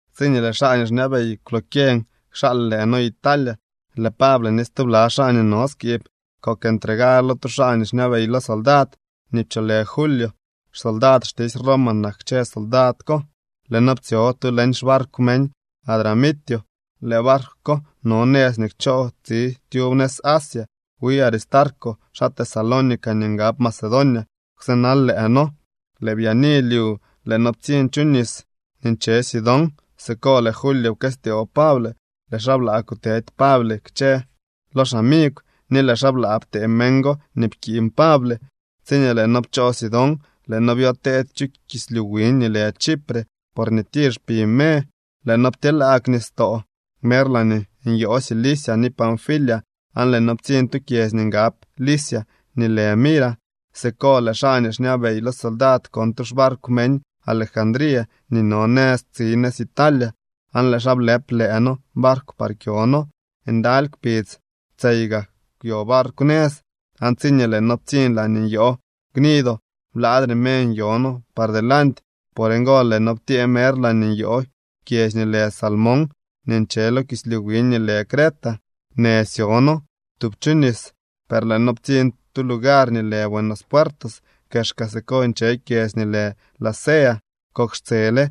Tsiñee lëë xaa nii xñabey kwlokyeñ kxaal lëë noo Italia, lëë Pable ni stubla xaa nii no skiib kok entregar lo tu xaa nii xñabey lo soldad nii pcholë Julio. Xsoldad xtisy Roma nak kchë soldad ko. Lëë noo ptsyo tu leñ xbarkw meñ Adramitio. Lëë barkw ko no nëz nii kchoo tsi tyub nëz Asia. Wi Aristarco, xaa Tesalónica nii ngab Macedonia, kwsënal lëë noo. Lëë byaani lyu lëë noo ptsiñ chu nis nii nche Sidón. Siko lëë Julio pkëstyoo Pable, lëë xaa blaa kutedy Pable kchë lo xamigw ni lëë xaa blaa ptee meñ go nii pkiiñ Pable. Tsiñee lëë noo pchoo Sidón, lëë noo byoteedy chu kislyu wiñ nii lë Chipre, porñee tir xpi me. Lëë noo ptyeelaag nistoo mer laañee nyoo Cilicia ni Panfilia, aan lëë noo ptsiñ tu kyedzy nii ngab Licia nii lë Mira. Siko lëë xaa nii xñabey lo soldad kon tu xbarkw meñ Alejandría nii no nëz tsi nëz Italia, aan lëë xaa blëp lëë noo barkw par kyo noo. Ndaly kpidz tseyga kwyo barkw nëz, aan tsiñee lëë noo ptsiñ laañee nyoo Gnido, blaadre me nyo noo par delanty. Por ngo lëë noo ptyee mer laañee nyoo kyedzy nii lë Salmón nii nche lo kislyu wiñ nii lë Creta. Në syo noo tub chu nis, per lëë noo ptsiñ tu lugar nii lë Buenos Puertos. Kexka siko nche kyedzy nii lë Lasea. Kok xtsele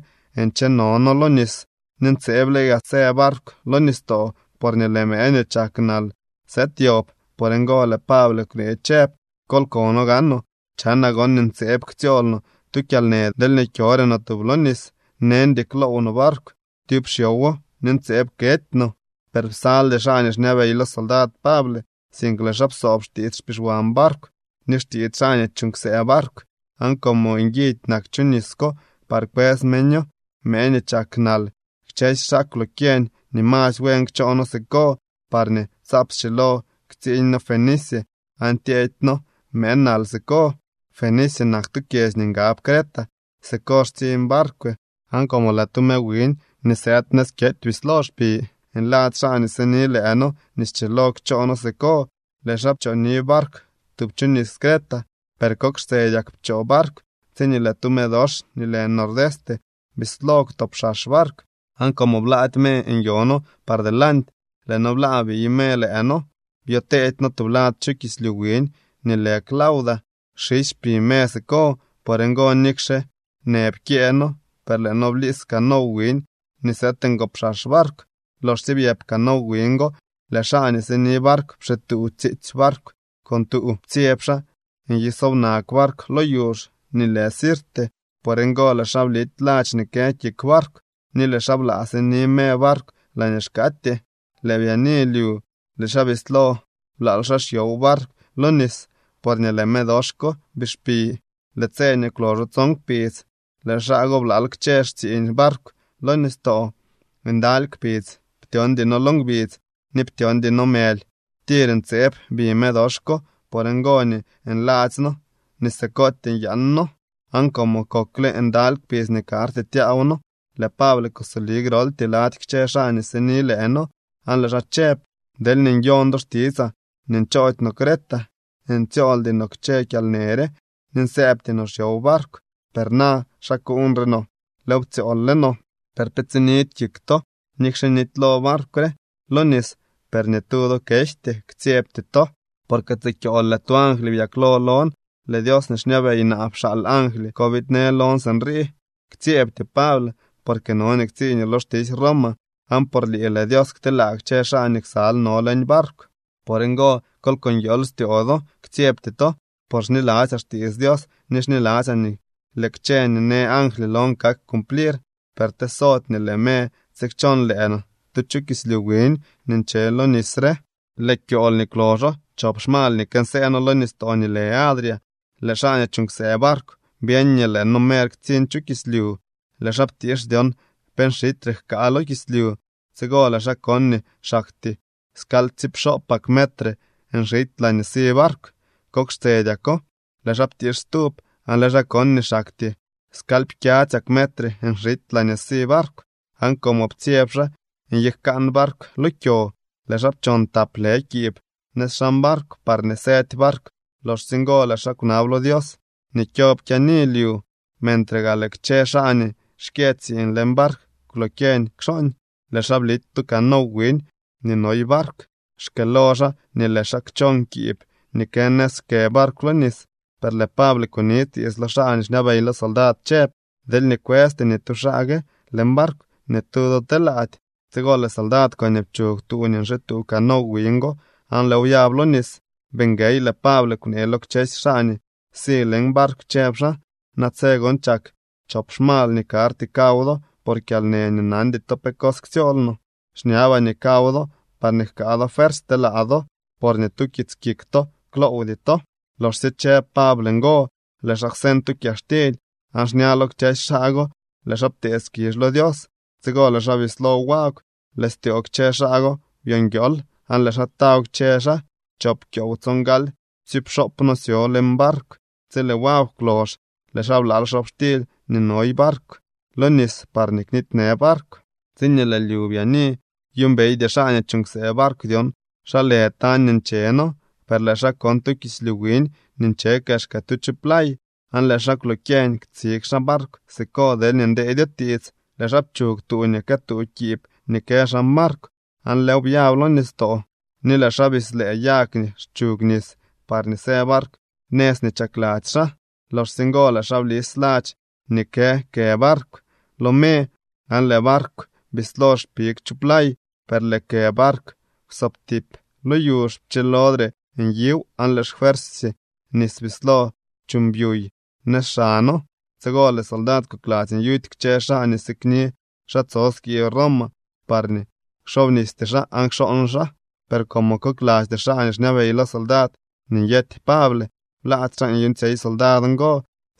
ncheno noo lo nis, ni ntseeble gaa së barkw lo nistoo, porñee lëë mëë nii chaknal sëëd yob. Por ngo lëë Pable kwnee chëb: —Kol kono gaanoo, chanaa gon nii ntseeb ktsyool no tu kyalnë deelñee kyore no tub lo nis. Neñdy kloow no barkw tyub xyowo, ni ntseeb kety no. Per psaldy xaa nii xñabey lo soldad Pable, sink lëë xaa psoob xtiits xpixwan barkw ni xtiits xaa nii chuuñ ksëë barkw. Aan como nguidy nak chu nis ko par kwës meño mëë nii chaknal, kchësy xaa kwlokyeñ nii masy buen kchoo noo siko, parñee tsaap schilo ktsiiñ noo Fenice aan tyeedy noo mëë nal siko. Fenice nak tu kyedzy nii ngab Creta. Siko xtsiñ barkw. Aan como lëë tu me wiñ nii sëëd nëz kyety bislo xpi, nladzy xaa nii sini lëë noo nii schilo kchoo noo siko. Lëë xaa pchooni barkw tub chu nis Creta. Per kok xtsedyak pchoo barkw tsiñee lëë tu medox nii lë Nordeste bislo kwtopxax barkw. Aan como blaady me nyo noo par delanty, lëë noo blaa biy me lëë noo. Byoteedy noo tublad chu kislyu wiñ nii lë Clauda. Xisy xpi me siko. Por ngo nikxe në pkyëë noo, per lëë noo bliis canow wiñ nii sëëdngopxax barkw. Loxsye byëp canow wiñ go, lëë xaa nii sini barkw pxituu tsiitsy barkw con tuu. Ptsyeb xaa nyisobnag barkw lo yuzh nii lë Sirte. Por ngo lëë xaa blity ladx nii kë kik barkw, ni lëë xaa blaa sini me barkw laañee xkaatyee. Lëë byaani lyu lëë xaa bislo blaal xaa xyow barkw lo nis porñee lëë medox ko bii xpi. Lëë tse nii kwloxo tson kpidz lëë xaa go blaal kchë xtsiiñ barkw lo nistoo. Ndaly kpidz ptyoondy noo lo ngbidz ni ptyoondy noo mëly. Tir ntseeb bi medox ko. Por ngo nii nladzy noo nii sikootyee nyaan noo. Aan como kokle ndaly kpidz nii karty tyaaw noo, lëë Pable kusoli groltyee lady kchë xaa nii sini lëë noo aan lëë xaa chëb: —Deelñee nyon do xtitsaa nii nchoody no Creta, ntsyooldy no kchë kyalnë re ni nsëëbty no xyow barkw. Per na xa kuuñre no. Lëëw ptsyool le no. Per pe tsinidy kik to. Nikxe nitylo barkw re lo nis, per ni tu do kejty. Ktsyebty to. Porque tsikyool lëë tu angly byaklo lon. Lëë Dios nii xñabey naa pxaal angly ko biidnë lon sinrii: “Ktsyeebtyoo, Pable, porque no nii ktsiiñoo lo xtisy Roma, aan por lii lëë Dios kteelaa kchë xaa nii ksal no leñ barkw.” Por ngo, kol ko nguiool styoo do, ktsyebty to, por xniladzyaa xtiits Dios ni xniladzyaa nii lëë kchë nii në angly lon kak cumplir. Per tesody nii lëë me tsikchon lëë no tu chu kislyu wiñ nii nche lo nis re. Lëë kyool nii kwloxo chop xmal nii kënsëë noo lo nistoo nii lë Adria, lëë xaa nii chuuñ ksëë barkw byeñ nii lëë noo mer ktsiñ chu kislyu. Lëë xaa ptiix dyon pe nxityre jkaa lo kislyu. Tsigo lëë xaa kon nii xaktyee skalyptsiipxoopak metre nxity laañee si barkw. Kok xtsedyako lëë xaa ptiix stub aan lëë xaa kon nii xaktyee skalypkyadzyak metre nxity laañee si barkw. Aan como ptsyeb xaa nyijkaan barkw lo kyo, lëë xaa pchon tap lë kiib nëz xan barkw parñee sëdy barkw. Loxsye ngo lëë xaa kwnab lo Dios nii kyob kyaani lyu. Mentre gaa lëë kchë xaa nii xkyë tsiiñ leñ barkw kwlokyeñ kxooñ, lëë xaa blity tu canow wiñ nii noy barkw, xkëëlo xaa nii lëë xaa kchon kiib nii kë nëz kë barkw lo nis. Per lëë Pable kuni tiits lo xaa nii xñabey lo soldad chëb: —Deelñee kwësty ni tu xaa gue leñ barkw, ni tu do telaady. Tsigo lëë soldad koñee pchug tuu nii nxituu canow wiñ go aan lëëw byab lo nis. Bii nguey, lëë Pable kwnee lo kchësy xaa nii si leñ barkw, chëb xaa: —Natse gon chak chop xmal nii karty kaw do por kyalnë nii nandy to pe cos ktsyool no. Xñabaa nii kaw do parñee jkaa do fuersy telaa do, por ni tu kits kik to kloowdy to. Loxsye chëb Pable ngo, lëë xaa kwseñ tu kyaxtily aan xña lo kchësy xaa go lëë xaa ptee skizh lo Dios. Tsigo lëë xaa bislo wagw. Lëë styoo kchë xaa go byonguiool aan lëë xaa taw kchë xaa. Choop kyoow tsongaly ptsiipxoop noo syo leñ barkw. Tsi lëë wagw kwlox lëë xaa blaal xobxtily nii noy barkw lo nis parñee knitynë barkw. Tsiñee lëë lyu byaani, byuumbeydy xaa nii chuuñ ksëë barkw dyon xa lë tañ nii nche noo. Per lëë xaa kon tu kislyu wiñ nii nche kexka tu chu play, aan lëë xaa kwlokyeñ ktsig xaa barkw siko deelñee ndeedyo tiits. Lëë xaa pchug tuu nii këtuu kiib nii kë xan barkw aan lëëw byab lo nistoo. Ni lëë xaa bislëë yag nii xchug nis parñee së barkw nëz nii chakladzy xaa. Loxsye ngo lëë xaa blis ladx nii kë kë barkw lo me, aan lëë barkw bislo xpig chu play. Per lëë kë barkw kwsobtip lo yuzh, pchilodre niw, aan lëë xfuersy nis bislo chuuñ pyuy nëz xano. Tsigo lëë soldad kokladzy nyuty kchë xaa nii sikni xaa tso skiib Roma parñee kxoobnisty xaa aan kxooñ xaa. Per como koklasty xaa nii xñabey lo soldad nii nyety Pable, blaady xaa nyuuñtsyey soldad ngo,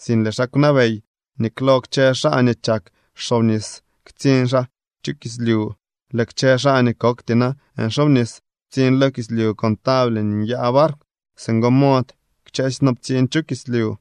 sink lëë xaa kwnabey nii klo kchë xaa nii chak xoobnis ktsiñ xaa chu kislyu. Lëë kchë xaa nii kokty na nxoobnis ptsiñ lo kislyu con table nii nyaa barkw. Singo mod kchësy noo ptsiñ chu kislyu.